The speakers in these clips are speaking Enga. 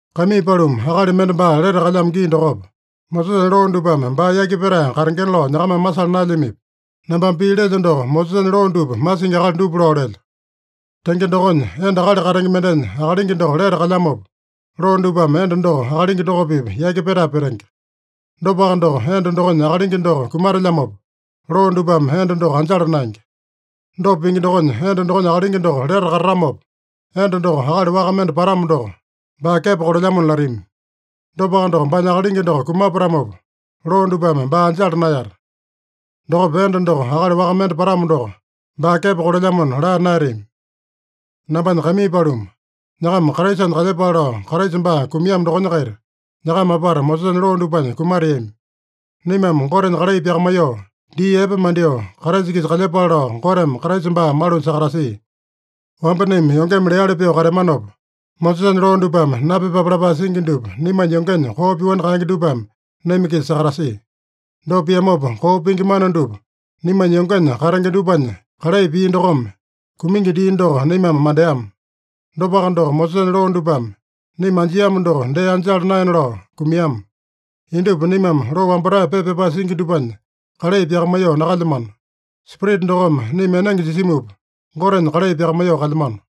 Kaimii paluma, akali mende baa lete kalyamo gii dokopa, Mosesanya loo dupame baa yaki petae katengena lao nyakamame masala naelyamipi? Nambame pii lelyo doko, Mosesanya loo dupa masingi akali dupa lao lelyo. Tenge dokonya, enda akali katenge mendenya akalingi doko lete kalyamopa, loo dupame enda doko akalingi doko-pipa yaki petae petenge. Dopaka doko, enda dokonya akalingi doko kumatelyamopa, loo dupame enda doko anjala naenge. Dopa pingi dokonya, enda dokonya akalingi doko lete katatamopa, enda doko akali waka mende patamo doko, baa kepo kolelyamona latami. Dopaka doko, baanya akalingi doko kumapatamopa, loo dupame baa anjala naeyata. Dokopa enda doko akali waka mende patamo doko, baa kepo kolelyamona laa naeyatami. Nambanya kaimii paluma, nyakama Kraisanya kalyepale lao Kraisa baa kumiamo dokonya-kaita nyakama apata Mosesanya loo dupanya kumateami. Naimame Gotenya kalai pyakamaiyoo, dii epe mandyoo, Kraisa-kisa kalyepale lao Goteme Kraisa baa malunya sakatasia. Wamba naima yongeme leali pyoo kateamanopa, Mosesanya loo dupame napyepape lapae singi dupa naimanya yongenya koo pyoani kaenge dupame naima-kisa sakatasia. Dopa piamopa, koo pingi mana dupa naimanya yongenya katenge dupanya kalai pia dokome, kumingi dii doko naimame mandeama. Dopaka doko, Mosesanya loo dupame naima anjiamo doko dee anjala naena lao kumiama. Indupa naimame loo wambatae pepa pyapae singi dupanya kalai pyakamaiyoo nakalyamano. Spirita dokome naima enenge jisimupa, Gotenya kalai pyakamaiyoo kalyamano.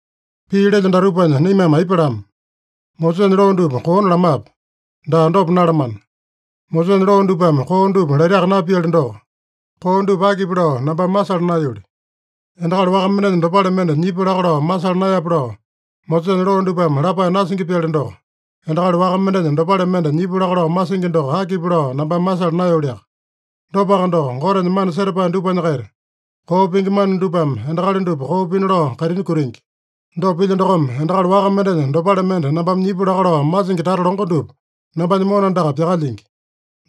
Pii lelyo datupanya naimame aipa lama? Mosesanya loo dupa koona lamape? Daa, dopa nalamana! Mosesanya loo dupame koo dupa laitaka napiali doko, koo dupa akipi lao nambame masala naeyoli. “Endakali waka mendenya dopale mende nyipu laka lao masala naeyape” lao Mosesanya loo dupame lapae nasingi-pyali doko, endakali waka mendenya dopale mende nyipu laka lao masingi doko akipi lao nambame masala naeyoliaka. Dopaka doko, Gotenya mana setapae dupanya-kaita koo pingi mana dupame endakali dupa koo pina lao kaitini kutingi. Dopa pilya dokome, endakali waka mendenya dopale mende nambame nyipu laka lao masingi tata longo dupa nambanya mona andaka pyakalyingi.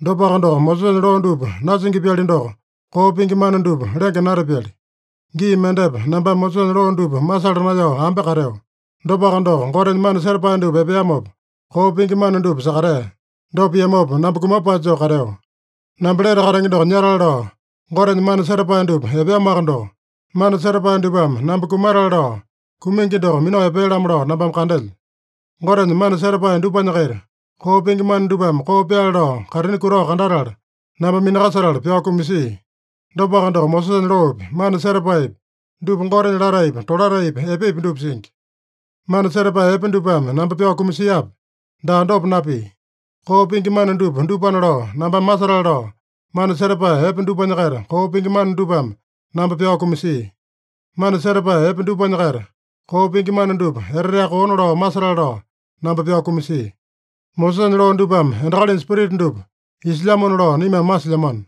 Dopaka doko, Mosesanya loo dupa nasingi-pyali doko, koo pingi mana dupa lenge natapyali. Gii mendepa nambame Mosesanya loo dupa masala naeyao ambe kateo. Dopaka doko, Gotenya mana setapae dupa epeamopa, koo pingi mana dupa sakatea. Dopa piamopa namba kumapae joo kateo. Namba lete katenge doko nyatale lao Gotenya mana setapae dupa epeamoaka doko, mana setapae dupame namba kumatale lao kumingi doko minao epea-lamo lao nambame kandelyo. Gotenya mana setapae dupanya-kaita koo pingi mana dupame koo pyaale lao kaitini kutao kandatala namba minakasetala pyao kumasia. Dopaka doko, Mosesanya loopi, mana setapaepi, dupa Gotenya lataepi, tolataepi, epepi dupa singi. Mana setapae epe dupame namba pyao kumasiape? Daa, dopa napia! Koo pingi mana dupa dupana lao nambame masetale lao, mana setapae epe dupanya-kaita koo pingi mana dupame namba pyao kumasia. Mana setapae epe dupanya-kaita koo pingi mana dupa eteteaka koona lao masetale lao namba pyao kumasia. Mosesanya loo dupame endakalinya spirita dupa isilyamona lao naimame masilyamano.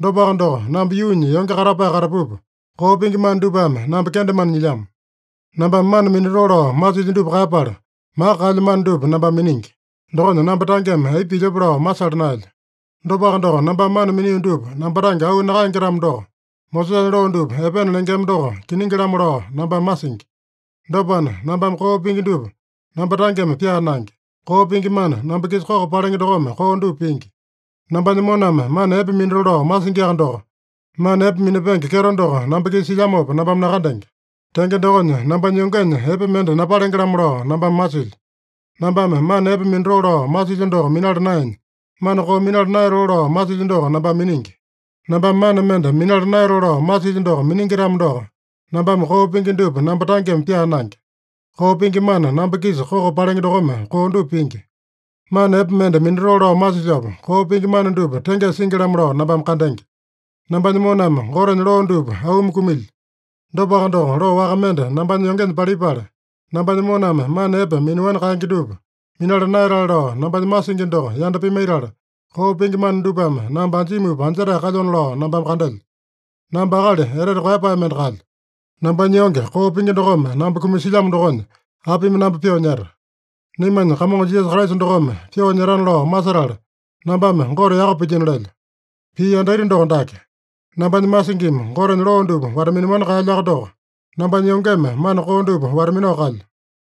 Dopaka doko, namba yuunya yonge katapae katapupa, koo pingi mana dupame namba kendemane nyilyamo. Nambame mana minatoo lao masilyo dupa kaeyapala, maka kaelyo mana dupa nambame miningi. Dokonya namba tangeme aipa pilyope lao masala naelyo. Dopaka doko, nambame mana minio dupa namba tange auu nakaenge-tamo doko, Mosesanya loo dupa epena lengema doko kiningi-lamo lao nambame masingi. Dopana, nambame koo pingi dupa namba tangeme pyaa naenge. Koo pingi mana, namba-kisa koko palenge dokome koo dupa pingi. Nambanya moname mana epe minatoo lao masingiaka doko, mana epe minapenge kyeto doko namba-kisa silyamopa nambame nakandenge. Tenge dokonya, nambanya yongenya epe mende napalenge-lamo lao nambame masilyo. Nambame mana epe minatoo lao masilyo doko minala naenya, mana koo minala naeyatoo lao masilyo doko nambame miningi. Nambame mana mende minala naeyatoo lao masilyo doko miningi-tamo doko, nambame koo pingi dupa namba tangeme pyaa naenge. Koo pingi mana, namba-kisa koko palenge dokome koo dupa pingi. Mana epe mende minatoo lao masilyopa, koo pingi mana dupa tengesa singi-lamo lao nambame kandenge. Nambanya moname Gotenya loo dupa auumi kumilyo. Dopaka doko, loo waka mende nambanya yongenya palipala, nambanya moname mana epe minaowani kaenge dupa minala naeyatale lao nambanya masingi doko yanda pimaitala, koo pingi mana dupame namba anjimupa anjetae kalyona lao nambame kandelyo. Namba akali etete koeyapae mende kalyo! Nambanya yonge koo pingi dokome namba kumasilyamo dokonya apimi namba pyoo nyeta? Naimanya Kamongo Jisasa Kraisa dokome pyoo nyetana lao masetala, nambame Gote yaka pilyino lelyo! Pii yandaita doko dake: Nambanya masingimi Gotenya loo dupa wata-minaowani kaelyoaka doko, nambanya yongeme mana koo dupa wata-minao kalyo.